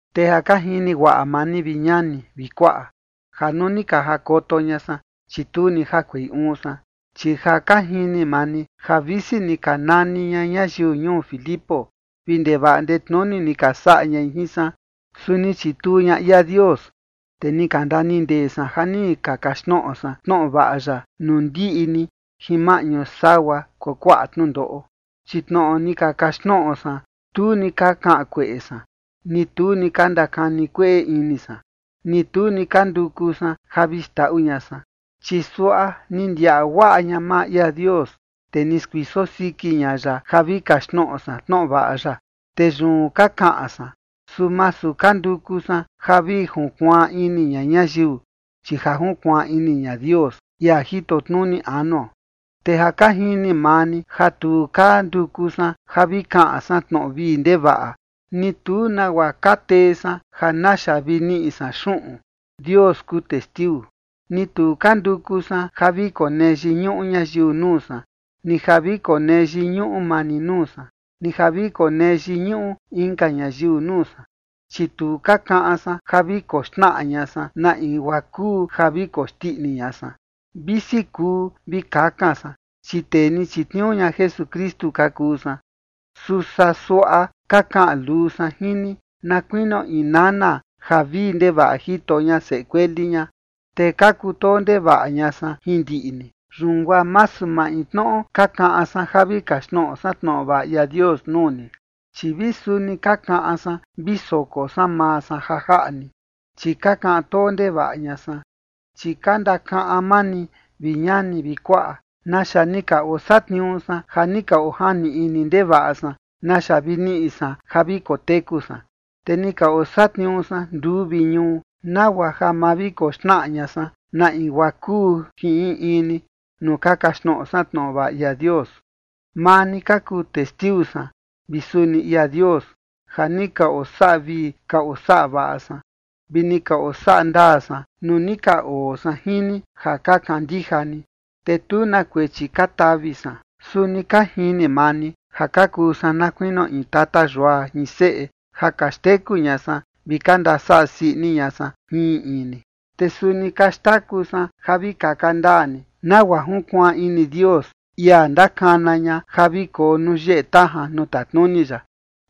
Te ja ka jini guaꞌa maa ni, vi ñani vi kuaꞌa, ja nuu ni ka jakoto ña san, chi tu ni jakuei uun san, chi ja ka jini maa ni ja visi ni ka nani ña ñayiu ñuu Filipo vi ndevaꞌa ndetnuni ni ka saꞌa ña jin san, su ni chituu ña ia Dios, te ni ka ndanindee san ja ni ka kaxtnoꞌo san tnoꞌo vaꞌa ya nuu ndiꞌi ni jin maꞌñu sagua kuakuaꞌa tnundoꞌo. Chi tnoꞌo ni ka kaxtnoꞌo san, tu ni ka kaꞌan kueꞌe san, ni tu ni ka ndakani kueꞌe ini san, ni tu ni ka nduku san ja vi xndaꞌu ña san. Chi suaꞌa ni ndiaꞌa guaꞌa ña maa ia Dios, te ni skuiso siki ña ya ja vi kaxtnoꞌo san tnoꞌo vaꞌa ya, te yun ka kaꞌan san. Su masu ka nduku san ja vi junkuaan ini ña ñayiu, chi ja junkuaan ini ña Dios, ia jito tnuni anuo. Te ja ka jini maa ni ja tu ka nduku san ja vi kaꞌan san tnoꞌo vii ndevaꞌa, ni tu nagua ka tee san ja naxa vi niꞌi san xuꞌun. Dios kuu testiu. Ni tu ka nduku san ja vi konee yiñuꞌu ñayiu nuu san, ni ja vi konee yiñuꞌu maa ni nuu san, ni ja vi konee yiñuꞌu inka ñayiu nuu san. Chi tu ka kaꞌan san ja vi koxnaꞌa ña san na in guaa kuu ja vi koxndiꞌni ña san, visi kuu vi kakan san, chi tee ni chitniuu ña Jesukristu ka kuu san. Su saa suaꞌa ka kaꞌan luu san jin ni, na kuinio in nana ja vii ndevaꞌa jito ña seꞌe kueli ña. Te ka kutoo ndevaꞌa ña san jin ndiꞌi ni, yun guaa masu maintnoꞌo ka kaꞌan san ja vi kaxtnoꞌo san tnoꞌo vaꞌa ia Dios nuu ni, chi vi suni ka kaꞌan san vi soko san maa san ja jaꞌa ni, chi ka kaꞌan too ndevaꞌa ña san. Chi ka ndakaꞌan maa ni, vi ñani vi kuaꞌa, naxa ni ka osatniuu san ja ni ka ojani ini ndevaꞌa san naxa vi niꞌi san ja vi koteku san. Te ni ka osatniuu san nduu vi ñuu, nagua ja ma vi koxnaꞌa ña san na in guaa kuu jin in in ni nuu ka kaxtnoꞌo san tnoꞌo vaꞌa ia Dios. Maa ni ka kuu testiu san vi suni ia Dios ja ni ka osaꞌa vii ka osaꞌa vaꞌa san vi ni ka osaꞌa ndaa san nuu ni ka oo san jin ni ja ka kandija ni, te tu na kuechi ka tavi san. Suni ka jini maa ni ja ka kuu san na kuinio in tata yua jin seꞌe ja ka xteku ña san vi ka ndasaꞌa sii ini ña san jin in in ni. Te suni ka xtaku san ja vi kaka ndaa ni, nagua junkuaan ini Dios, ia ndakana ña ja vi koo nuu yeꞌe tajan nuu tatnuni ya.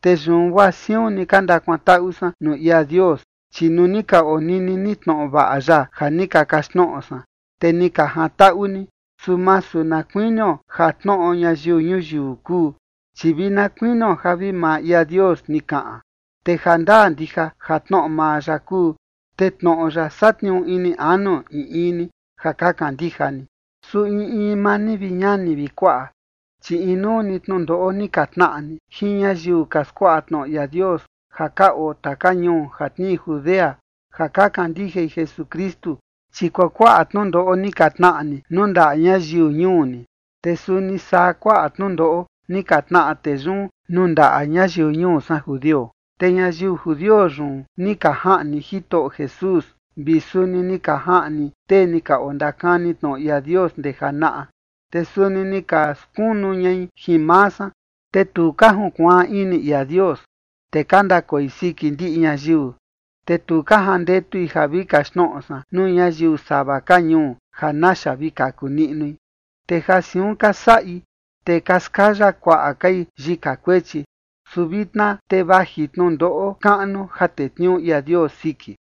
Te yun guaa siun ni ka ndakuantaꞌu san nuu ia Dios, chi nuu ni ka onini ni tnoꞌo vaꞌa ya ja ni ka kaxtnoꞌo san, te ni ka jantaꞌu ni, su masu na kuinio ja tnoꞌo ñayiu ñuyiu kuu, chi vi na kuinio ja vi maa ia Dios ni kaꞌan, te ja ndaa ndija ja tnoꞌo maa ya kuu. Te tnoꞌo ya satniuu ini anu in in ni ja ka kandija ni. Su in in maa ni, vi ñani vi kuaꞌa, chi inuu ni tnundoꞌo ni ka tnaꞌa ni jin ñayiu ka skuaꞌa tnoꞌo ia Dios ja ka oo taka ñuu ja tnii Judea ja ka kandijai Jesukristu. Chi kuakuaꞌa tnundoꞌo ni ka tnaꞌa ni nuu ndaꞌa ñayiu ñuu ni, te suni saa kuaꞌa tnundoꞌo ni ka tnaꞌa tee yun nuu ndaꞌa ñayiu ñuu san judio. Te ñayiu judio yun ni ka jaꞌni Jitoꞌo Jesús, vi suni ni ka jaꞌni tee ni ka ondakani tnoꞌo ia Dios ndee janaꞌa. Te suni ni ka skunu ñai jin maa san. Te tu ka junkuaan ini ia Dios, te ka ndakoi siki ndiꞌi ñayiu. Te tu ka jandetui ja vi kaxtnoꞌo san nuu ñayiu sava ka ñuu ja naxa vi kaku niꞌnui. Te ja siun ka saꞌi, te ka skaya kuaꞌa kai yika kuechi. Su vitna te vaji tnundoꞌo kaꞌnu ja tetniuu ia Dios siki.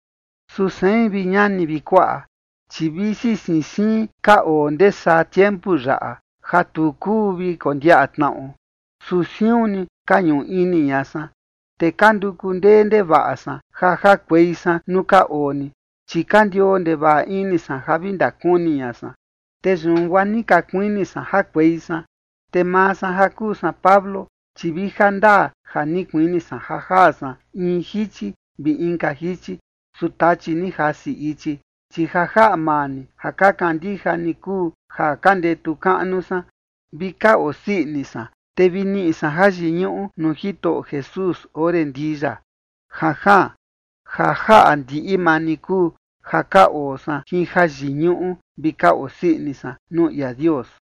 Su sein, vi ñani vi kuaꞌa, chi visi siin siin ka oo ndee saa tiempu yaꞌa, ja tu kuu vi kondiaꞌa tnaꞌo, su siun ni ka ñuꞌu ini ña san. Te ka nduku ndee ndevaꞌa san ja jakuei san nuu ka oo ni, chi ka ndioo ndevaꞌa ini san ja vi ndakuni ña san. Te yun guaa ni ka kuini san jakuei san. Te maa san ja kuu san Pablo, chi vi ja ndaa ja ni kuini san ja jaa san in jichi vi inka jichi, su Tachi ni jasi ichi. Chi ja jaꞌa maa ni ja ka kandija ni kuu ja ka ndetu kaꞌnu san, vi ka osii ini san, te vi niꞌi san jayiñuꞌu nuu Jitoꞌo Jesús ore ndii ya. Janjaan. Ja jaꞌa ndiꞌi maa ni kuu ja ka oo san jin jayiñuꞌu vi ka osii ini san nuu ia Dios.